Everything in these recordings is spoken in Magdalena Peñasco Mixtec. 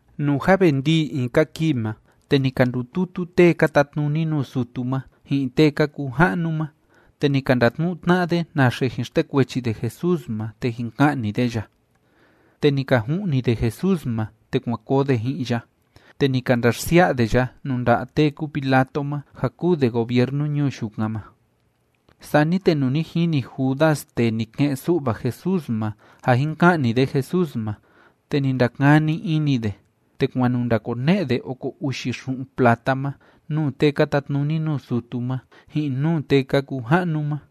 Nuu jâ ve ndii in‑ka kii ma, te ni ka ndututu tee ka tatnuni nuu sutu ma, ji'in tee ka kuu ja'nu ma, te ni ka ndatnu'u tna'a de naxe jin xtekuechi de Jesús ma te jin ka'ni de ya. Te ni ka ju'ni de Jesús ma, te kuan koo de ji'in ya, te ni ka ndaxsia'a de ya nuu nda'a tee kúu Pilato ma, ja kúu de gobiernu ñuu yukan ma. Sani te nuu ni jini Judas tee ni ke'en‑su'va Jesús ma ja jin ka'ni de Jesús ma, te ni ndakani ini de, te kuan nu ndakone'e de oko uxi xu'un plata ma nuu tee ka tatnuni nuu sutu ma, ji'in nuu tee ka kuu ja'nu ma.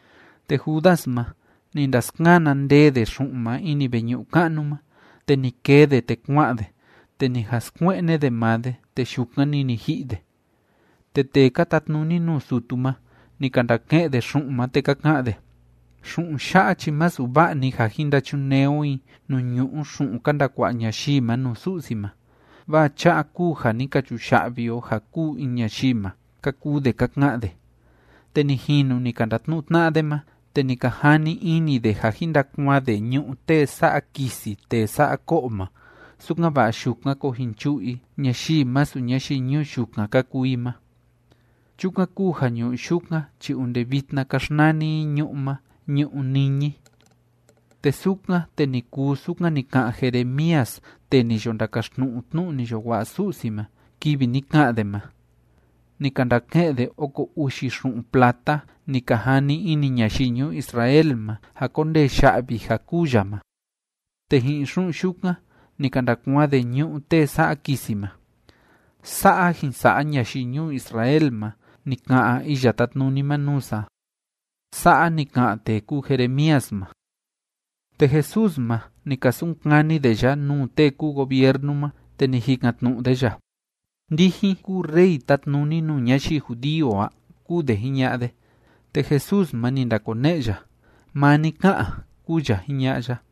Te Judas ma, ni ndaskana ndee de xu'un ma ini veñu'u ka'nu ma, te ni kee de, te kua'an de, te ni jan skue'ne de maa de, te yukan‑ni ni ji'i de. Te tee ka tatnuni nuu sutu ma, ni ka ndake'en de xu'un ma, te ka ka'an de: ―Xu'un ya'a chi masu va'a‑ni ja jin ndachunee o i nuu ñu'u xu'un ka ndakua'a ñayii ma nuu Su'si ma, vaa cha'a kúu ja ni ka chuya'vi o ja kûu in ñayii ma ―ka kuu de ka ka'an de. Te ni jinu ni ka ndatnu'u tna'a de ma, te ni ka jani ini de ja jin ndakuaan de ñu'ú tee sa'a kisi tee sa'a ko'o ma, sukan‑va'a yukan koo jin chu'u i ñayii masu ñayii ñuu yukan ka kuu i ma. Chukan kúu ja ñu'ú yukan chi onde vitna ka xnani i ñu'ú ma Ñu'ú Niñi. Te sukan, te ni kuu sukan ni ka'an Jeremías tee ni yo ndakaxtnu'u tnu'u ni yo wa'a Su'si ma, kivi ni ka'an de ma: “Ni ka ndake'en de oko uxi xu'un plata ni ka jani ini ñayii ñuu Israel ma ja kondee ya'vi ja kûu ya ma. Te ji'in xu'un yukan ni ka ndakuaan de ñu'ú tee sa'a kisi ma. Sa'a jin sa'a ñayii ñuu Israel ma, ni ka'an Iya Tátnuni ma nuu sa a”, sa'a ni ka'an tee kúu Jeremías ma. Te Jesús ma, ni ka sunkani de ya nuu tee kúu gobiernu ma, te ni jikan‑tnu'u de ya: ―¿Ndijin kúu rey tátnuni nuu ñayii judío a? ―kúu de jiña'a de. Te Jesús ma, ni ndakone'e ya: ―Maa ni ká'an ―kúu ya jiña'a ya.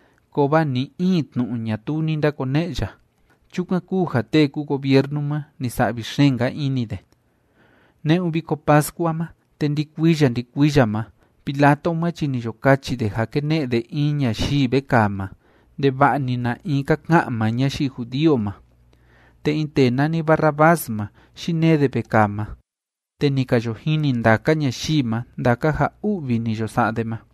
Kovaa ni‑in tnu'u ñatuu ni ndakone'e ya. Chukan kúu ja tee kúu gobiernu ma, ni sa'vi xeen‑nka ini de. Ne'un Viko Pascua ma, te ndi‑kuiya ndi‑kuiya ma Pilato ma chi ni yo kachi de ja kene'e de in ñayii vekaa ma, ndeva'a‑ni na in ka ka'an maa ñayii judío ma. Te in tee nani Barrabás ma, yinee de vekaa ma, te ni ka yo jini ndaka ñayii ma ndaka ja u'vi ni yo sa'a de ma.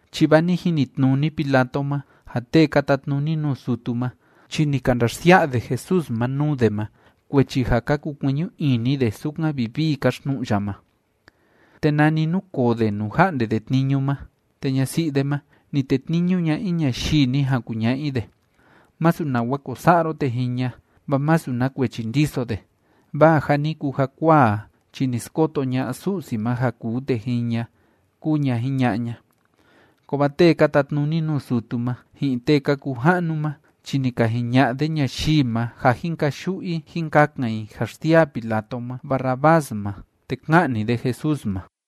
chi vaa ni jinitnuni Pilato ma ja tee ka tatnuni nuu sutu ma chi ni ka ndaxsia'a de Jesús ma nuu de ma kuechi ja ka kukueñu ini de sukan vivii káxtnu'u ya ma. Te nani núkoo de nuu ja'nde de tniñu ma, te ñasi'i de ma, ni tetniñu ña in ñayii ni jan kuña'a i de: “Masu nawa ko sa'a ro tee jiña, vaa masu na kuechi ndiso de, vaa ja ni kuu jakuaa a chi ni skoto ña'a Su'si ma ja kuu tee jiña”, kúu ña jiña'a ña. Kovaa tee ka tatnuni nuu sutu ma, ji'in tee ka kuu ja'nu ma chi ni ka jiña'a de ñayii ma ja jín kayu'u i jín kakan i ja xsiaa Pilato ma Barrabás ma te ka'ni de Jesús ma.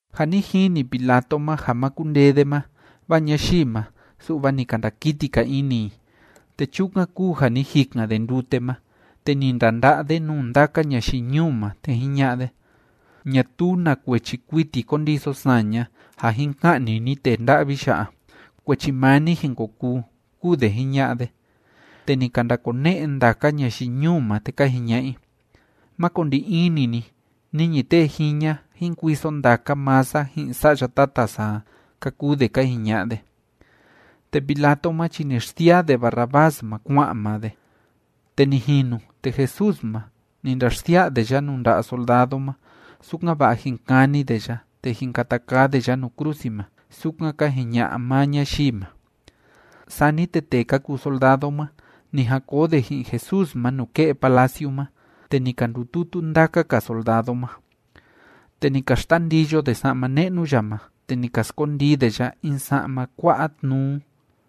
Jâ ni jini Pilato ma ja ma kundee de ma, vaa ñayii ma, su'va ni ka ndakiti‑ka ini i. Te chukan kúu ja ni jikan de ndute ma, te ni ndanda'a de nuu ndaka ñayii ñuu ma, te jiña'a de: ―Ñatuu na kuechi kuiti kondiso saña ja jin ka'ni ni tee nda'vi ya'a. Kuechi maa ni jin ko kuu ―kúu de jiña'a de. Te ni ka ndakone'e ndaka ñayii ñuu ma, te ka jiña'a i: ―Má ko ndi ini ni, niñi tee jiña jín kuiso ndaka maa sa ji'in sa'ya tata sa a ―ka kuu de ka jiña'a de. Te Pilato ma chi ni xsiaa de Barrabás ma kua'an maa de. Te ni jinu, te Jesús ma, ni ndaxsia'a de ya nuu nda'a soldado ma, sukan‑va'a jín kani de ya te jín kata kaa de ya nuu krusi ma, sukan ka jiña'a maa ñayii ma. Sani te tee ka kuu soldado ma, ni jan koo de ji'in Jesús ma nuke'e palaciu ma, te ni ka ndututu ndaka‑ka soldado ma. Te ni ka xtandiyo de sa'ma ne'nu ya ma, te ni ka skondii de ya in sa'ma kua'a tnuu.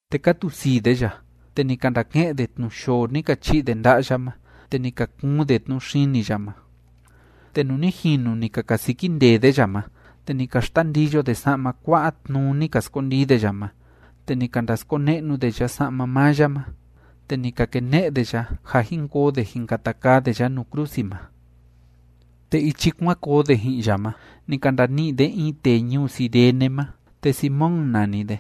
Te ka tusii de ya, te ni ka ndake'en de tnu yoo ni ka chi'i de nda'a ya ma, te ni ka kuun de tnu xini ya ma. Te nuu ni jinu ni ka kasiki ndee de ya ma, te ni ka xtandiyo de sa'ma kua'a tnuu ni ka skondii de ya ma, te ni ka ndaskone'nu de ya sa'ma maa ya ma, te ni ka kene'e de ya, ja jin koo de jin kata kaa de ya nuu krusi ma. Te ichi kuan koo de ji'in ya ma, ni ka ndani'i de in tee ñuu Cirene ma te Simón nani de.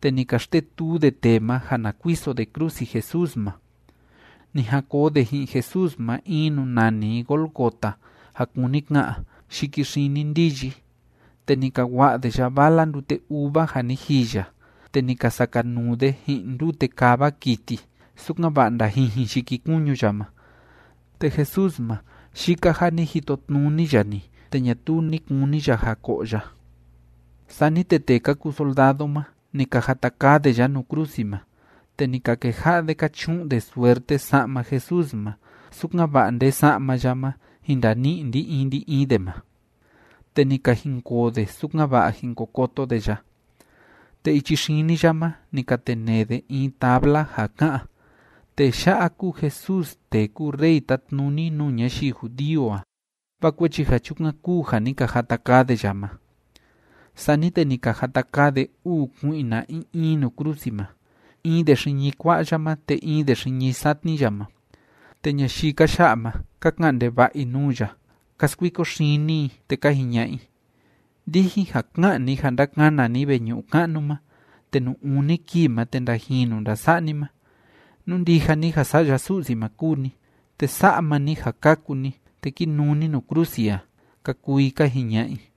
Te ni ka xtetuu de tee ma ja na kuiso de krusi Jesús ma. Ni jan koo de ji'in Jesús ma in nuu nani i Gólgota ja kúni ka'an “Yiki Xini Ndiyi”. Te ni ka wa'a de ya vala ndute uva ja ni jiya, te ni ka sakanuu de ji'in ndute kava kiti, sukan‑va'a ndajijin yikikuñu ya ma. Te Jesús ma, yika ja ni jitotnuni ya‑ni, te ñatuu ni kuni ya ja ko'o ya. Sani te tee ka kuu soldado ma, ni ka jata kaa de ya nuu krusi ma. Te ni ka keja'a de ka chu'un de suerte sa'ma Jesús ma, sukan‑va'a nde sa'ma ya ma jin ndani'i ndi‑in ndi‑in de ma. Te ni ka jinkoo de, sukan‑va'a jin ko koto de ya. Te ichi xini ya ma ni ka tenee de in tabla ja ká'an: “Tee ya'a kúu Jesús tee kúu rey tátnuni nuu ñayii judío a”, vaa kuechi ja chukan kúu ja ni ka jata kaa de ya ma. Sani te ni ka jata kaa de uu kui'na in in nuu krusi ma, in de xiñi kua'a ya ma te in de xiñi satni ya ma. Te ñayii ka ya'a ma, ka ka'an ndeva'a i nuu ya, ka skuiko xini i, te ka jiña'a i: ―Ndijin ja ká'an ni ja ndakana ni veñu'u ka'nu ma te nuu uni kii ma te ndajinu ndasa'a ni ma, nú ndija ni ja Sa'ya Su'si ma kúu ni, te sa'a maa ni ja kaku ni, te ki nuu ni nuu krusi a ―ka kuu i ka jiña'a i.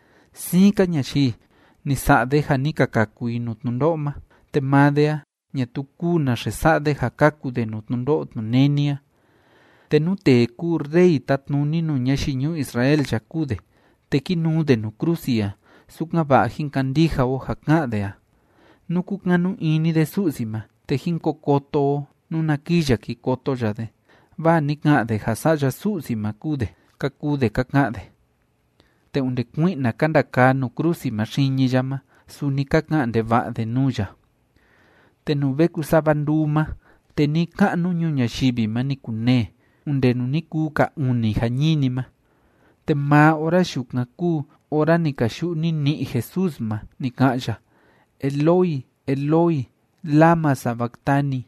―Siin‑ka ñayii, ni sa'a de ja ni ka kaku i nuu tnundo'o ma, te maa de a, ñatuu kúu naxe sa'a de ja kaku de nuu tnundo'o tnuneni a. Te nú tee kúu rey tátnuni nuu ñayii ñuu Israel ya kúu de, te kí nuu de nuu krusi a, sukan‑va'a jín kandija o ja ká'an de a. Nú kúkanu ini de Su'si ma, te jín ko koto o nuna kii ya ki koto ya de. Vaa ni ka'an de ja Sa'ya Su'si ma kúu de ―ka kuu de ka ka'an de. Te onde kui'na ka ndakaa nuu krusi ma xiñi ya ma, suni ka ka'an ndeva'a de nuu ya. Te nuu ve kusava nduu ma, te ni‑ka'nu ñuu ñayivi ma ni kunee, onde nuu ni kuu ka uni jañini ma. Te maa ora yukan kúu ora ni kayu'u nini'i Jesús ma ni ka'an ya: ―Eloi, Eloi, ¿lama sabactani?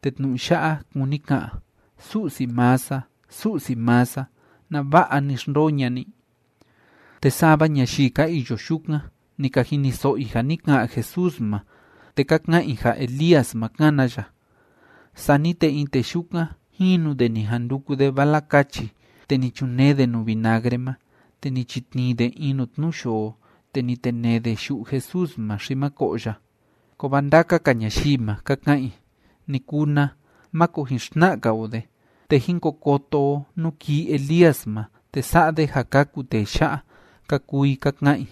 Te tnu'u ya'a kúni ka'an, “Su'si maa sa, Su'si maa sa, ¿nava'a ni xndoo ña'a ni?” Te sava ñayii ka iyo yukan, ni ka jiniso'o i ja ni ka'an Jesús ma, te ka ka'an i ja Elías ma kána ya. Sani te in tee yukan, jinu de ni jan nduku de vala kachi, te ni chunee de nuu vinagre ma. Te ni chitnii de in nuu tnu yoo, te ni tenee de yu'u Jesús ma, xi ma ko'o ya. Kovaa ndaka‑ka ñayii ma, ka ka'an i: ―Ni kuu na. Máko jin xtna'a‑ka o de, te jín ko koto o nú kii Elías ma te sa'a de ja kaku tee ya'a ―ka kuu i ka ka'an i.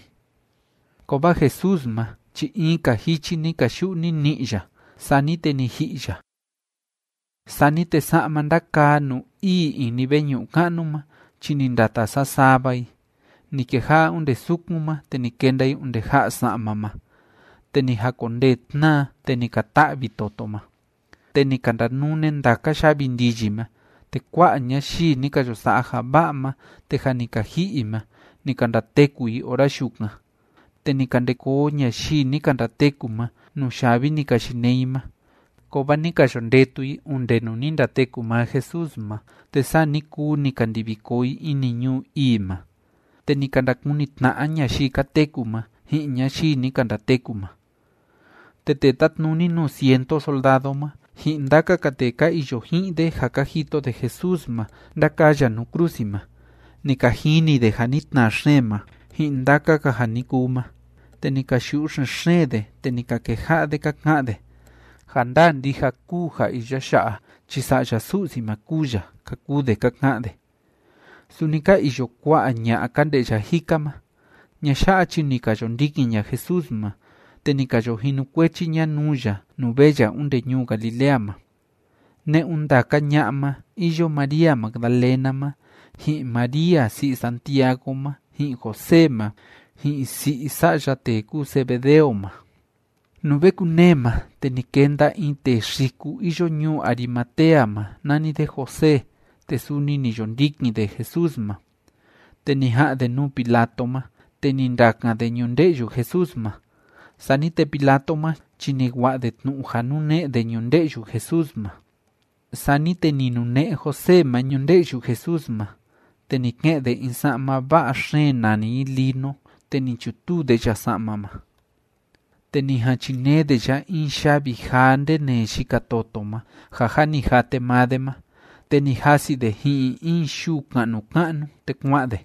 Kovaa Jesús ma chi in‑ka jichi ni kayu'u nini'i ya. Sani te ni ji'i ya. Sani te sa'ma ndakaa nuu ii ini veñu'u ka'nu ma chi ni ndata sasava i, ni keja'a onde sukun ma, te ni kenda i onde ja'a sa'ma ma. Te ni jakondee tnaa, te ni ka ta'vi toto ma. Te ni ka ndanune ndaka yavi ndiyi ma, te kua'a ñayii ni ka yo sa'a ja va'a ma te jâ ni ka ji'i i ma, ni ka ndateku i ora yukan. Te ni ka nde koo ñayii ni ka ndateku ma nuu yavi ni ka yinee i ma, kovaa ni ka yo ndetu i onde nuu ni ndateku maa Jesús ma, te saa ni kuu ni ka ndivi koo i ini ñuu ii ma, te ni ka ndakuni tna'a ñayii ka teku ma ji'in ñayii ni ka ndateku ma. Te tee tátnuni nuu ciento soldado ma, ji'in ndaka‑ka tee ka iyo ji'in de ja ka jito de Jesús ma ndákaa ya nuu krusi ma, ni ka jini de ja ni tnaa xeen ma, ji'in ndaka‑ka ja ni kuu ma, te ni ka yu'u xen‑xeen de, te ni ka keja'a de ka ka'an de: ―Ja ndaa ndija kúu ja iya ya'a chi Sa'ya Su'si ma kúu ya ―ka kuu de ka ka'an de. Suni ka iyo kua'a ña'a ka nde'ya jika ma. Ña'a ya'a chi ni ka yo ndikin ña Jesús ma, te ni ka yo jinukuechi ña nuu ya nuu vee ya onde ñuu Galilea ma. Ne'un ndaka ña'a ma iyo María Magdalena ma, ji'in María si'i Santiago ma ji'in José ma, ji'in si'i sa'ya tee kúu Zebedeo ma. Nuu ve kunee ma, te ni kenda in tee xiku iyo ñuu Arimatea ma, nani de José, te suni ni yo ndikin de Jesús ma. Te ni ja'an de nuu Pilato ma, te ni ndakan de ñunde'yu Jesús ma. Sani te Pilato ma chi ni wa'a de tnu'u ja nune'e de ñunde'yu Jesús ma. Sani te ni nune'e José ma ñunde'yu Jesús ma, te ni ke'en de in sa'ma va'a xeen nani i lino, te ni chutuu de ya sa'ma ma. Te ni jan chinee de ya in yavi jaa ndenee yika toto ma, ja jâ ni jate maa de ma, te ni jasi de ji'in in yuu ka'nu ka'nu, te kua'an de.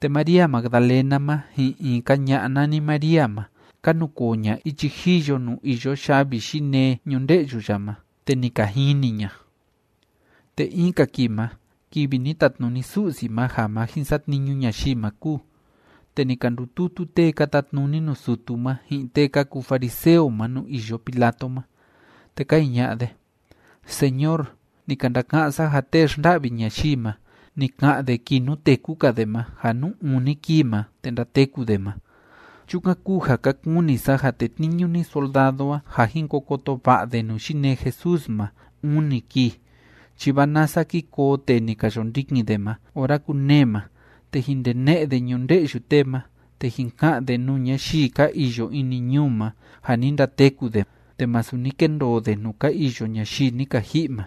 Te María Magdalena ma, ji'in in‑ka ña'a nani María ma, ka nukoo ña ichi jiyo nuu iyo yavi yinee ñunde'yu ya ma, te ni ka jini ña. Te in‑ka kii ma, kivi ni tatnuni Su'si ma ja ma jin satniñu ñayii ma kúu, te ni ka ndututu tee ka tatnuni nuu sutu ma, ji'in tee ka kuu fariseo ma nuu iyo Pilato ma. Te ka jiña'a de: ―Señor, ni ka ndaka'án sa ja tee xnda'vi ñayii ma, ni ka'an de kii nuu téku‑ka de ma ja nuu uni kii ma, te ndateku de ma. Chukan kúu ja ka kuni sa ja tetniñu ni soldado a ja jin ko koto va'a de nuu yinee Jesús ma uni kii. Chi vaa nasa ki koo tee ni ka yo ndikin de ma ora kunee ma, te jin ndene'e de ñunde'yu tee ma, te jin ka'an de nuu ñayii ka iyo ini ñuu ma ja ni ndateku de te masu ni kendoo de nuu ka iyo ñayii ni ka ji'i ma.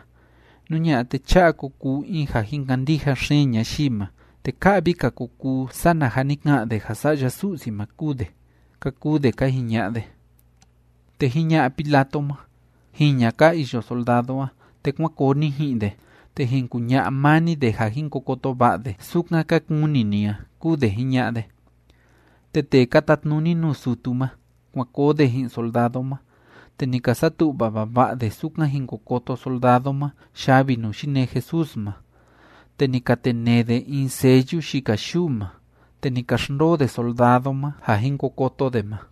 Nú ña'a, te cha'a ko kuu in ja jin kandija xeen ñayii ma, te ka'vi‑ka ko kuu sana ja ni ka'an de ja Sa'ya Su'si ma kúu de ―ka kuu de ka jiña'a de. Te jiña'a Pilato ma: ―Jiña ka iyo soldado a, te kuán koo ni ji'in de. Te jin kuña'a maa ni de ja jin ko koto va'a de, sukan ka kuni ni a ―kúu de jiña'a de. Te tee ka tatnuni nuu sutu ma, kuan koo de ji'in soldado ma, te ni ka satu'va vava'a de sukan jin ko koto soldado ma yavi nuu yinee Jesús ma. Te ni ka tenee de in sellu yika yuu ma, te ni ka xndoo de soldado ma ja jin ko koto de ma.